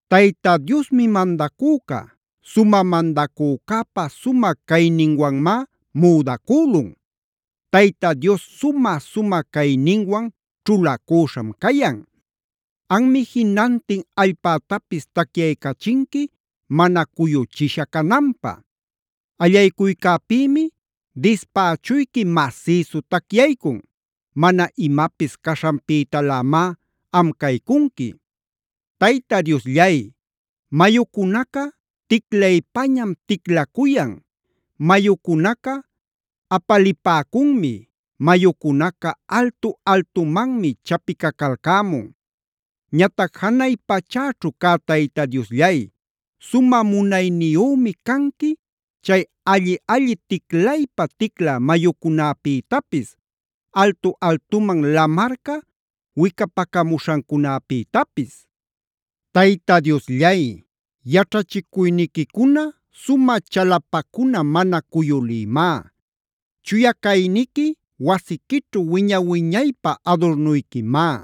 ¡Tayta Diosmi mandacüca! ¡Sumä mandacücäpa sumä cayninwanmá müdacülun! ¡Tayta Dios sumä-sumä cayninwan ćhulacüśham cayan! Anmi jinantin allpätapis tacyaycachinqui mana cuyuchisha cananpä. Allaycuycäpïmi dispächuyqui masïsu tacyaycun. Mana imapis caśhanpïtalämá am caycunqui. Tayta Diosllay, mayucunaca ticlaypañam-ticlacuyan, mayucunaca apalipäcunmi, mayucunaca altu-altumanmi chapicacalcämun. Ñatac janay pachäćhu cä Tayta Diosllay sumä munayniyümi canqui chay alli-alli ticlaypa-ticlä mayucunäpïtapis, altu-altuman lamarca wicapacamuśhancunapïtapis. Tayta Diosllay, yaćhachicuyniquicuna sumä chalapacuna mana cuyulïmá. Chuya cayniqui wasiquićhu wiña-wiñaypä adurnuyquimá.